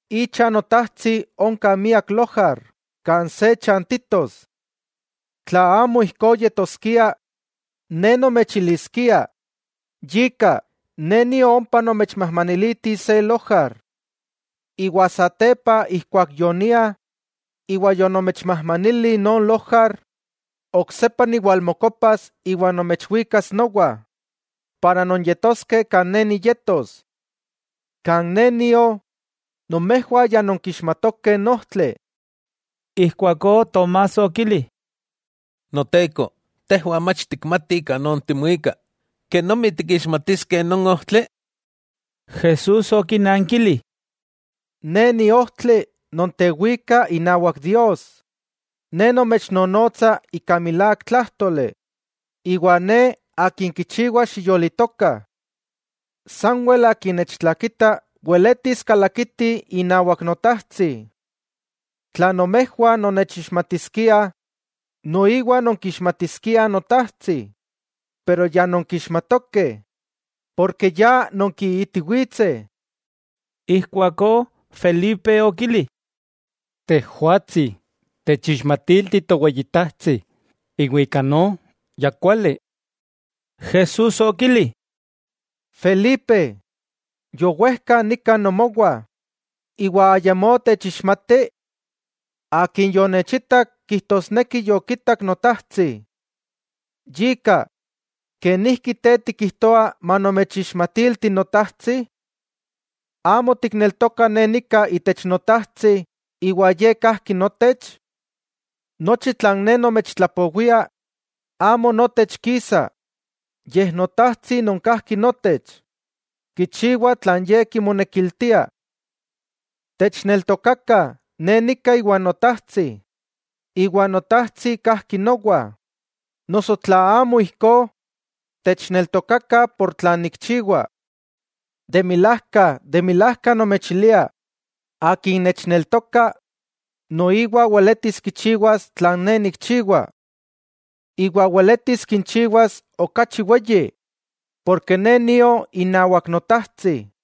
Icha Notajtsi onka miak lojar kan se chantitos. Tla amo ijkó yetoskia, Ne nomechiliskia. Yika, Ne nio ompa nomechmajmaniliti se lojar. Satepa ijkuak yonia iwa yonomechmajmanili non lojar, oksepa niwalmokopas iwa nomechwikas nowa, nonyetoskeh kan Ne niyetos. Kan Ne nio, nomejwah ya nonkixmatokeh n ojtli. Ijkuakó Tomás okili: —Noteko, tejwah mach tikmatih kanon timuika, ¿kenomi tikixmatiskeh non ojtli? Jesús okinankili: —Ne Ni ojtli nontewika inawak Dios, Ne nomechnonotsa ika milák tlájtoli, iwa Ne Akin kichiwa xiyolitokah. Sanwel akin nechtlakita weletis kalakiti inawak Notajtsi. Tla nomejwah nonnechixmatiskiah, noiwa nonkixmatiskiah Notajtsi, axa ya nonkixmatokeh, porke ya nonkiitiwitseh. Ijkuakó Felipe okili: —Tejwatsi, techixmatilti Toweyitajtsi iwa ika no, ya kuali. Jesús okili: —Felipe, yowejka nika nomowah, ¿iwa ayamó techixmati? Akin yonechitak kijtosneki yokitak Notajtsi. Yika ¿kenijki te tikijtoa manomechixmatilti Notajtsi? ¿Amo tikneltoka Ne nika itech Notajtsi iwa Ye kajki notech? Nochi tlan Ne nomechtlapowia, amo notech kisa, yej Notajtsi non kajki notech, kichiwa tlan Ye kimonekiltia. Techneltokakah Ne nika iwa Notajtsi, iwa Notajtsi kajki nowa, noso tla amo ijkó, techneltokakah por tlan nikchiwa. De milajka, de milajka nomechilia: Akin nechneltoka, noiwa weletis kichiwas tlan Ne nikchiwa. Iwa weletis kinchiwas okachi weyi, porke Ne nio inawak Notajtsi.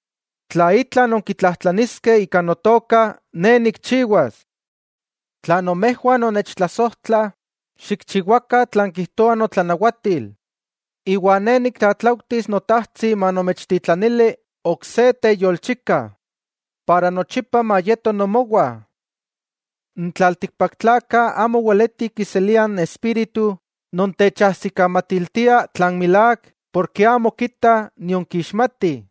Tla itla nonkitlajtlaniskeh ika Notoka Ne nikchiwas. 'Tla nomejwah nonnechtlasojtlah, xikchiwakah tlan kijtoa notlanawatil. Iwa Ne niktlatlaujtis Notajtsi manomechtitlanili ok se teyolchika, para nochipa mayeto nomowah. N tlaltikpaktlakah amo weletih kiseliah n Espíritu non techajsikamatiltiah tlan milák porke amo kitah nion kixmatih.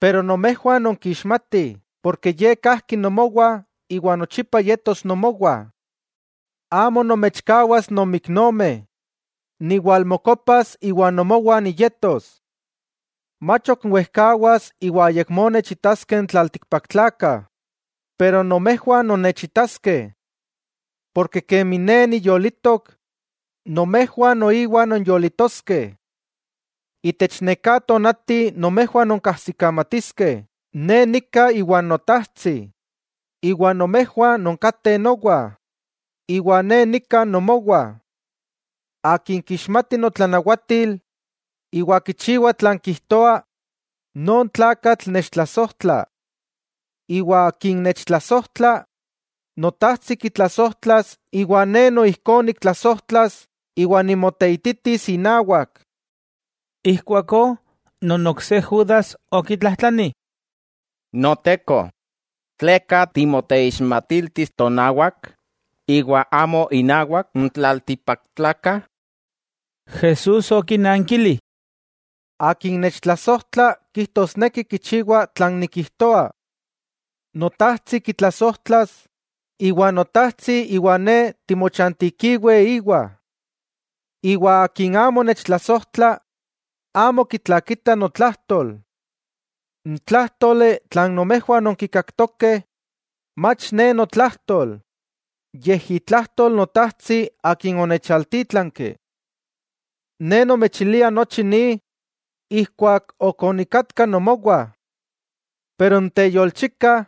Pero nomejwah nonkixmatih porke Ye kajki nomowah iwa nochipa yetos nomowah. Amo nomechkawas nonmiknomeh, niwalmokopas iwa nomowah niyetos. Mach ok wejkawas iwa ayakmó nechitaskeh n tlaltikpaktlakah, pero nomejwah nonnechitaskeh. Porke kemi Ne niyolitok, nomejwah noiwa nonyolitoskeh. Itech neká tonati nomejwah nonkajsikamatiskeh Ne nika iwa Notajtsi, iwa nomejwah nonkateh nowa, iwa Ne nika nomowah. Akin kixmati notlanawatil, iwa kichiwa tlan kijtoa, non tlakatl nechtlasojtla. Iwa akin nechtlasojtla, Notajtsi kitlasojtlas iwa Ne noijkó niktlasojtlas iwa nimoteititis inawak. Ijkuakó non ok se Judas okitlajtlani: —Noteko ¿tleka timoteixmatiltis tonawak, iwa amo innawak n tlaltikpaktlakah? Jesús okinankili: —Akin nechtlasojtla kijtosneki kichiwa tlan nikijtoa. Notajtsi kitlasojtlas, iwa Notajtsi iwa Ne timochantikiweh íwa. Iwa akin amo nechtlasojtla, amo kitlakita notlajtol. N tlájtoli tlan nomejwah nonkinkaktokeh, mach Ne notlajtol yej itlajtol Notajtsi Akin onechaltítlanki. 'Ne onomechili nochi ni ijkuak onikatka nomowah. Pero n teyolchika,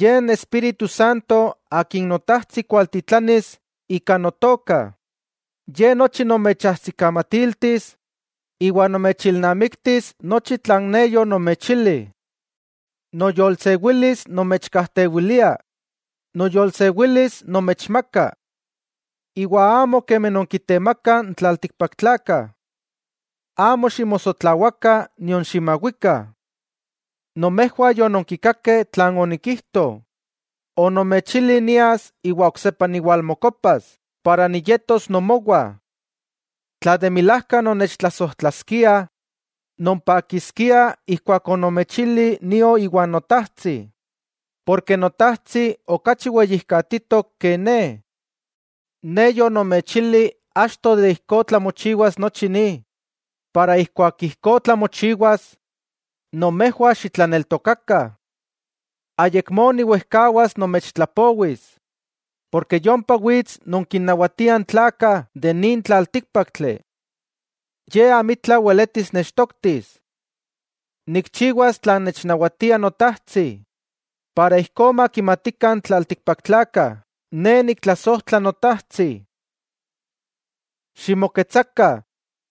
Ye n Espíritu Santo Akin Notajtsi kualtitlanis ika Notoka, Ye nochi nomechajsikamatiltis, iwa nomechilnamiktis nochi tlan Ne yonomechili. 'Noyolsewilis nomechkajtewilia, noyolsewilis nomechmaka. Iwa amo kemi non kitemakah n tlaltikpaktlakah. Amo ximosotlawakah nion ximawikah. Nomejwah yononkikakeh tlan onikijto, onomechili nias iwa oksepa niwalmokopas para niyetos nomowah. Tla de milajka nonnechtlasojtlaskiah, nompakiskiah ijkuak onomechili nio íwa Notajtsi, porke Notajtsi okachi weyijkatitok ke Ne. Ne achto yonomechili ijkó tlamochiwa, yika ijkuak ijkó tlamochiwas, nomejwah xitlaneltokakah. 'Ayakmó niwejkawas nomechtlapowis, porke yompa wits non kinnawatia n tlakah de nin tlaltíkpaktli. Ye amitla weletis nechtoktis. Nikchiwas tlan nechnawatia Notajtsi, para ijkó makimatikah n tlaltikpaktlakah, Ne niktlasojtla Notajtsi. 'Ximoketsakah.